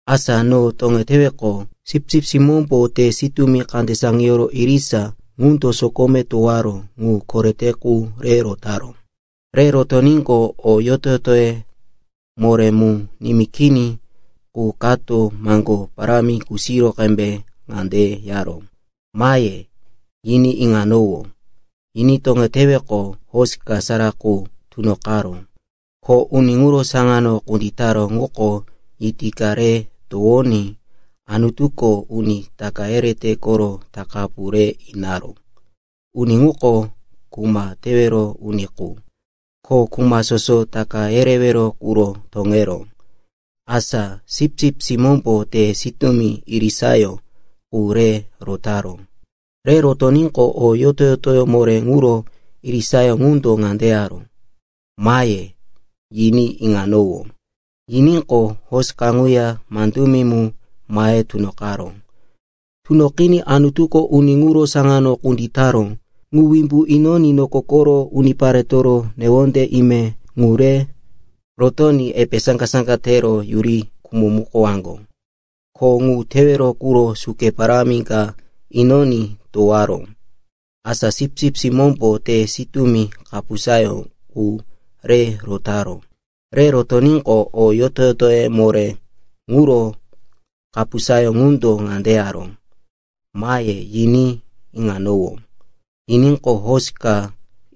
Asa no toŋeteweqo, Sipsip Simómbo te sitúmi kande saŋiyoro irisa ŋundo sokome towaró ŋu korete qu re rotaró. Re rotoníqo, o yoto-yotoye moré mu nimí kini qu kato maŋgó parámi kusiro qembe ŋande yaró, “Mahe,” yiní iŋanowó. Yiní toŋeteweqo, hosi ka sara qu tunoqaró, ko uni ŋuro saŋano kunditaró ŋuko yiti ka re towoní Anutuko uni taka yerete koro takapu re inaró. Uni ŋuko kuma takawero uni qu, ko kuma soso taka yerewero quro toŋeró. Asa Sipsip Simómbo te sitúmi irisayó qu re rotaró. Re rotoníqo, o yoto-yotoye moré ŋuro irisayó ŋundo ŋande yaró, “Mahe,” yiní iŋanowó. Yiníqo, hosi kaŋuya, mandumi mu, mahe tunoqaró. Tunoqiní Anutuko uni ŋuro saŋano kunditaró ŋu wimbu inoní noko koro uniparetoro newonde ime ŋu re rotoní epe saŋga-saŋga tero yuri khumomukowaŋgo. Kho ŋu tewero quro suke parámi ka inoní towaró. Asa Sipsip Simómbo te sitúmi kapusayó qu re rotaró. Re rotoníqo, o yoto-yotoye moré ŋuro kapusayó ŋundo ŋande yaró, “Mahe,” yiní iŋanowó. Yiníqo, hosi ka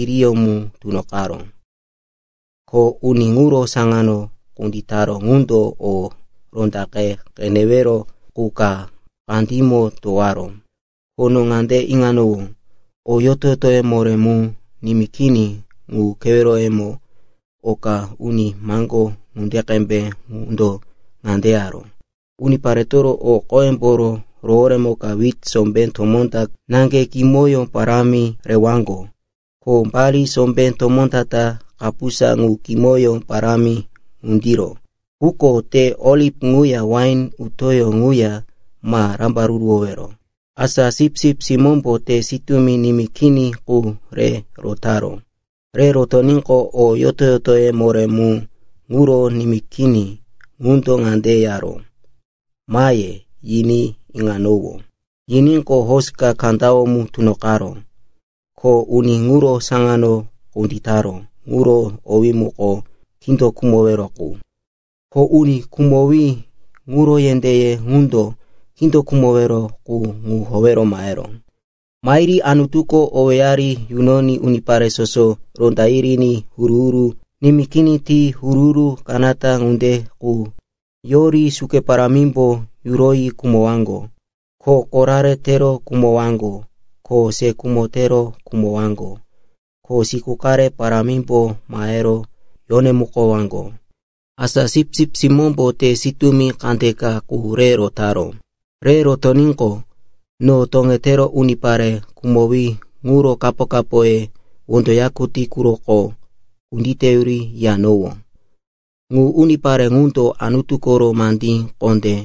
iriyó mu tunoqaró, ko uni ŋuro saŋano kunditaró ŋundo o rondaŋe qenewero qu ka kandímo towaró. Ko no ŋande iŋanowó, o yoto-yotoye moré mu nimí kini ŋu keweroyemo oka uni maŋgó ŋunde qembe ŋundo ŋande yaró, “Uniparetoro o qoyemboro roworemoka wit sombé tomó ta naŋge kimoyó parámi rewaŋgo, ko bali sombé tomó ta-ta kapusa ŋu kimoyó parámi ŋundiro. Quko te oliv ŋuya wain utó ŋuya ma rambaruruwowero.” Asa Sipsip Simómbo te sitúmi nimí kini qu re rotaró. Re rotoníqo, o yoto-yotoye moré mu ŋuro nimí kini ŋundo ŋande yaró, “Mahe,” yiní iŋanowó. Yiníqo, hosi ka kandawó mu tunoqaró, ko uni ŋuro sano kunditaró ŋuro owí muko “Kindo Khumowero Qu.” Ko uni khumowí ŋuro yendéye ŋundo Kindo Khumowero Qu ŋu howero maheró. Mahiri Anutuko owéyari yunoní unipare soso ronda yiri huru-huru nimí kini ti huru-huru kanata ŋunde qu yori suke parámimbo yuroyi khumowaŋgo, ko korare tero khumowaŋgo, ko se khumo tero khumowaŋgo, ko siku qare parámimbo mahero yonemukowaŋgo. Asa Sipsip Simómbo te sitúmi kandeka qu re rotaró. Re rotoníqo, no toŋetero unipare khumowí ŋuro kapo-kapoye wondo yakutí quroko kunditeyuri yiyanowó. Ŋu unipare ŋundo Anutu koro mandí kondé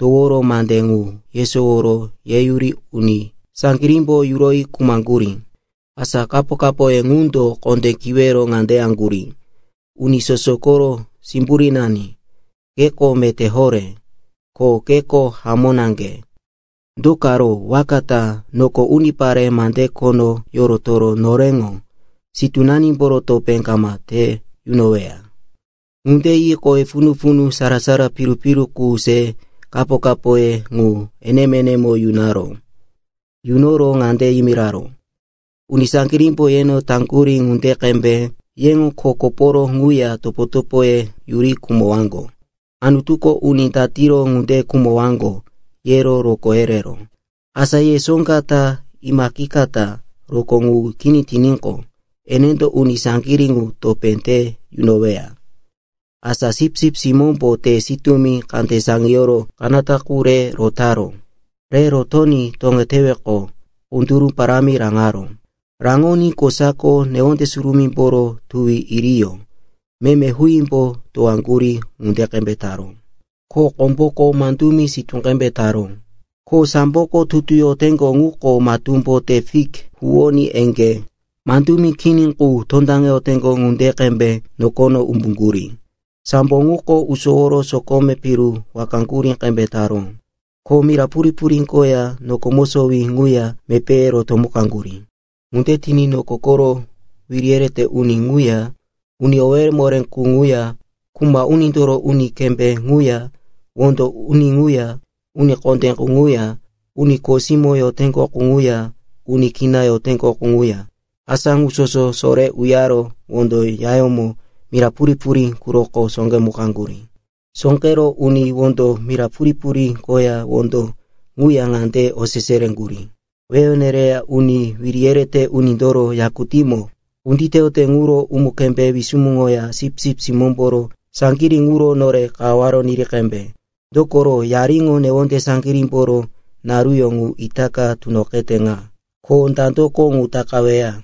toworo mande ŋu yesoworo yeyuri uni saŋgirímbo yuroyi khumaŋgurí. Asa kapo-kapoye ŋundo kondé kiwero ŋande yaŋgurí, “Uni soso koro Simburínani, keko meté horé, ko keko hamó naŋge. Do karo waka ta noko unipare mande khono yorotoro noreŋo sitúnanimboro topé kama te yunoweya?” Ŋunde yi kowe punu-punu sara-sara piru-piru qu se kapo-kapoye ŋu enemo-enemo yunaró. Yunoro ŋande yimiraró, “Uni saŋgirímbo yeno taŋgurí ŋunde qembe yeŋo kho koporo ŋuya topo-topoye yuri khumowaŋgo. Anutuko uni datiro ŋunde khumowaŋgo, yero rokó yereró. Asa ye soŋga ta imaqikata rokó ŋu kini tiníqo, enendo uni saŋgirí ŋu topé te yunoweya.” Asa Sipsip Simómbo te sitúmi kande saŋiyoro kanata qu re rotaró. Re rotoní toŋeteweqo, kunduru parámi raŋaró. Raŋoní kosako newonde surumímboro tuwi iriyó meme huímbo towaŋgurí ŋunde qembe taró. Ko komboko mandumi sitú qembe taró. Ko samboko tutu yoteŋgo ŋuko matúmbo te fik huwoní eŋgé mandumi kini qu tondaŋeteŋgo ŋunde qembe nokono umbuŋgurí. Sambo ŋuko usoworo sokome piru wakaŋgurí qembe taró. Ko mira purí-purí koya noko mosowí ŋuya mepéye rotomukaŋgurí. Ŋunde tiní noko koro wiri yerete uni ŋuya, uni owéye moré qu ŋuya, kuma unindoro uni kembé ŋuya, wondo uni ŋuya, uni kondé qu ŋuya, uni kho simó yoteŋgo qu ŋuya, uni kina yoteŋgo qu ŋuya, asa ŋu soso sore uyaro wondo yayómo mira purí-purí quroko sóqemukaŋgurí. Sóqero uni ŋundo mira purí-purí koya wondo ŋuya ŋande osese yereŋgurí, “Wehe nereya uni wiri yerete unindoro yakutímo kunditeyote ŋuro umu-kembé wisumuŋoya Sipsip Simómboro saŋgirí ŋuro nore kawaware niri qembe! Dokoro, yariŋo newonde saŋgirímboro naruyó ŋu itaka tunoqete ŋa. Ko dandoko ŋu takaweya?”